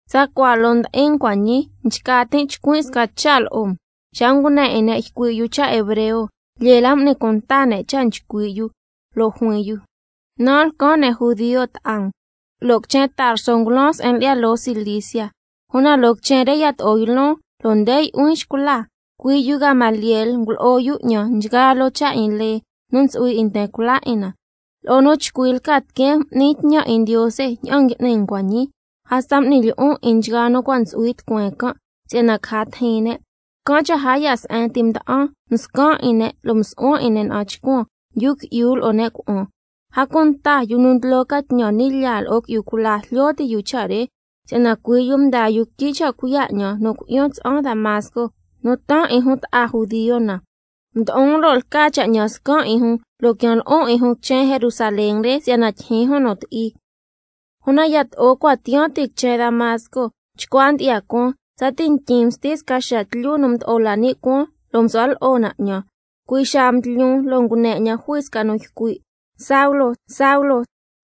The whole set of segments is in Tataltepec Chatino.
Tsacua loo ndi'in um cua' ñii, nchca tin' chcuin' sca cha' lo'o um. Xa ngune 'in ne' ycui' yu cha' hebreo, lyee la m'ni cunta ne' cha' nu nchcui' yu. Lo' juin yu: Nan' lcan ne' judio ta'a um, lo' quichen Tarso ngulan se'en lyi'ya loo Cilicia. Una loo quichen re yato'o ylon, lo' nde yu'huin xcula. Cui' yu Gamaliel ngulo'o yu 'ñan nchgaa loo cha' 'in lee nu ntsu'hui 'in nten cula 'in na. Lo'o nu chcui lca tiqueen m'nin tñan 'in Ndiose ña'an ngui'ni um cua' ñii. Hasta m'nin lyi'on 'in nchgaa nu cua' ntsu'hui Tucueen can', si'yana caja tijin ne'. Can' cha' a ya' se'en ti mda'an, mscan' 'in ne' lo' msu'huan 'in ne' na'an chcuan, yu qui'yu lo'o ne' cuna'an. A cunta yu nu ndlo ca tñan ni' lyaa lo'o qui'yu cula jlyo ti' yu cha' re, si'yana cui' yu mdaa yu quityi cha' cuiya' 'ñan nu cui'yan tsa'an quichen Damasco, nu taan 'in jun ta'a judio na. Mdo'on, lo' lca cha' 'ñan scan' 'in jun, lo' quian lo'on 'in jun quichen Jerusalén re, se'en nu ntsu'hui cha' tyijyin jun nu ti'i. Una yato'o cua' tyi'an tin quichen Damasco, chcua ndyi'ya cuaan, tsati ntyin msti sca xaa tlyu nu mdo'o la ni' cuaan, lo' msu'hua lo'o na 'ñan. Cui' xaa mdlyun, lo' ngune 'ñan jui sca nu ycui', lo' juin 'ñan: Saulo, Saulo,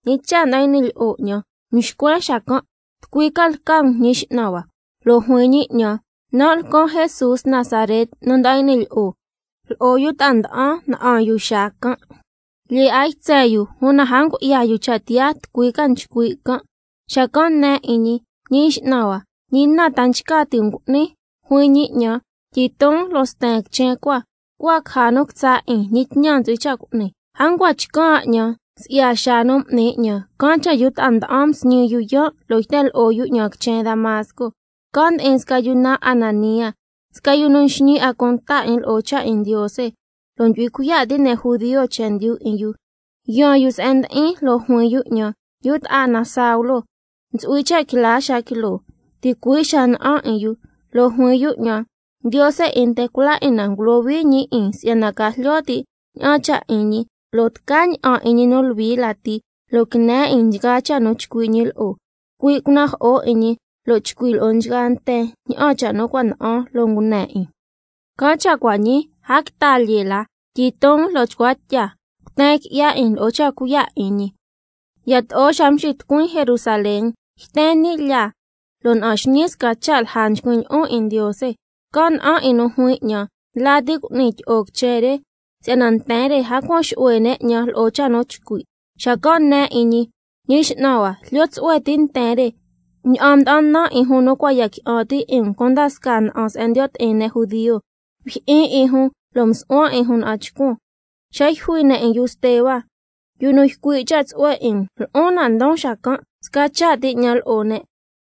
¿ñi cha' nda'an y'ni lyi'o 'ñan? Mxcuen xacan': ¿Tucui ca lca um, Ñi X'nan hua? Lo' juin ñi 'ñan: Nan' lcan Jesús Nazaret nu nda'an y'ni lyi'o. Lo'o yu ta'a nda'an na'an yu xaa can', lyee 'a ytsen yu, una a ngu'ya yu cha' tiyaa tucui ca ycui' can'. Xacan' nen 'in ñi: Ñi X'nan hua, ¿ñi na ta nchca ti' um cu'nin? Lo' juin ñi 'ñan: Tyiton lo' sten quichen cua, cua caja nu quitsa' 'in ñi tñan ntsu'hui cha' cu'ni. A ncua chcan' 'a 'ñan si'ya xaa nu m'ni 'ñan, can' cha' yu ta'a nda'an msñi yu yaan', lo' yten lo'o yu 'ñan quichen Damasco. Can' ndi'in sca yu naan Ananía, sca yu nu nxñi 'a cunta 'in lo'o cha' 'in Ndiose, lo' ndyu'hui cuiya' ti' ne' judio chendyu 'in yu. Yaan yu se'en ndi'in lo' juin yu 'ñan: Yu ta'a na Saulo, ntsu'hui cha' quila xaa quiloo xiya'. Ticui' xaa na'an 'in yu. Lo' juin yu 'ñan: Ndiose 'in nten cula 'in na ngulohui ñi 'in, si'yana ca jlyo ti' ña'an cha' 'in ñi, lo' tca ña'an 'in ñi nu Luhui lati, lo' quine 'in nchgaa cha' nu chcui' ñi lo'o. Cui' cunajo'o 'in ñi lo' chcui' lo'o nchgaa nten tsaña'an cha' nu cua' na'an lo' ngune 'in. Can' cha' cua' ñii, a quita lyee la. Tyiton lo' chcua tya, lo' cuten qui'ya 'in lo'o cha' cuiya' 'in ñi. Yato'o xa mxitucuin quichen Jerusalén, yten ni' lyaa lo' na'an xñii sca cha' lja nchcuin' lyi'on 'in Ndiose. Can' na'an 'in nu juin 'ñan: Ndla ti cu'ni tyi'o quichen re, si'yana nten re a cuan xu'hue ne' 'ñan lo'o cha' nu chcui'. Xacan' nen 'in ñi: Ñi X'nan hua, jlyo tsu'hue ti' nten re ña'an mda'an nan 'in jun nu cua' ya qui'an ti' 'in um cunda scaa se'en ndiyo' ti'in ne' judio, mjyi'in 'in jun lo' msu'huan 'in jun na'an chcuan. Xa yjui ne' 'in yu Steba, yu nu ycui' cha' tsu'hue 'in um, lo'on nan' ndon xacan', sca cha' ti 'ñan lo'o ne',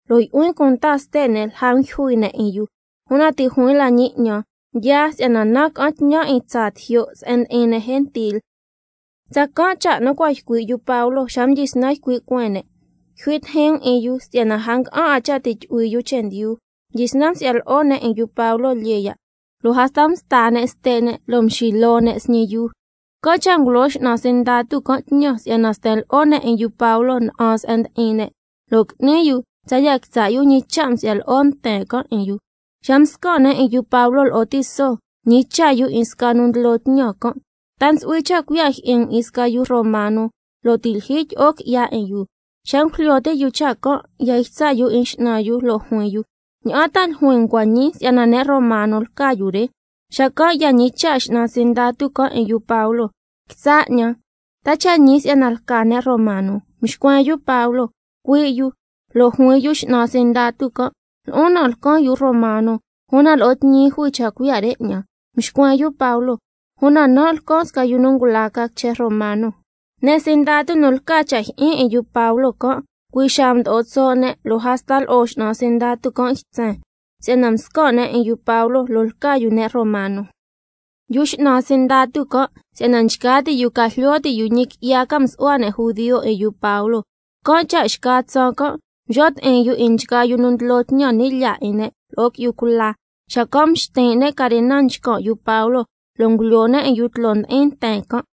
lo' yu'huin cunta ste' ne' lja ndyujui ne' 'in yu. Una ti' juin la ñi 'ñan: Yaa, si'yana nan' ca'an tñan 'in tsaa tijyo' se'en ndi'in ne' gentil. Tsacan' cha' nu cua' ycui' yu Pablo xa mdyisnan ycui' cueen ne': Yjui tijin um 'in yu si'yana a nga'an 'a cha' ti' tyu'hui yu chendyu. Mdyisnan msi'ya lo'o ne' 'in yu Pablo lyee ya', lo' hasta msta ne' ste' ne' lo' mxiloo ne' sñi yuu. Can' cha' cui' xaa ngulo x'nan sindatu can' tñan, si'yana sten lo'o ne' 'in yu Pablo na'an se'en ndi'in ne' lo' qui'ni yu tsaya' quitsa' yu ñi cha' nsi'ya lo'o nten can' 'in yu. Xa mscan' ne' 'in yu Pablo lo'o tiso, mñicha' yu 'in sca nu ndlo tñan can': ¿Ta ntsu'hui cha' cuiya' jyi'in um 'in sca yu romano, lo' ti' lyijyi tyi'o qui'ya 'in yu? Xa ngujlyo ti' yu cha' can', cui' xaa ya ytsa' yu 'in x'nan yu, lo' juin yu: ¿Ña'an ta ljuin um cua' ñii si'yana ne' romano lca yu re? Xacan' ya ñicha' x'nan sindatu can' 'in yu Pablo: Quitsa' 'ñan, ¿ta cha' ñi si'yana lca ne' romano? Mxcuen yu Pablo: Cui' yu. Lo' juin yu x'nan sindatu can': Lo'on na lcan yu romano, una lo'o tñi jui cha' cuiya' re 'ñan. Xacan' mxcuen yu Pablo: Una nan' lcan sca yu nu ngula ca quichen romano. Ne' sindatu nu lca cha' jyi'in 'in yu Pablo can', cui' xaa mdo'o tso' ne' lo' hasta lo'o x'nan sindatu can' ytsen, si'yana mscan' ne' 'in yu Pablo, lo' lca yu ne' romano. Yu x'nan sindatu can' si'yana nchca ti' yu ca jlyo ti' yu ñi qui'ya ca msu'hua ne' judio 'in yu Pablo, can' cha' xca tsaan can' mxo' ti'in yu 'in nchgaa yu nu ndlo tñan ni' lyaa 'in ne' lo'o qui'yu cula, xacan' mxtin' ne' carena nchcan' yu Pablo lo' ngulyoo ne' 'in yu tloo ndi'in nten can'.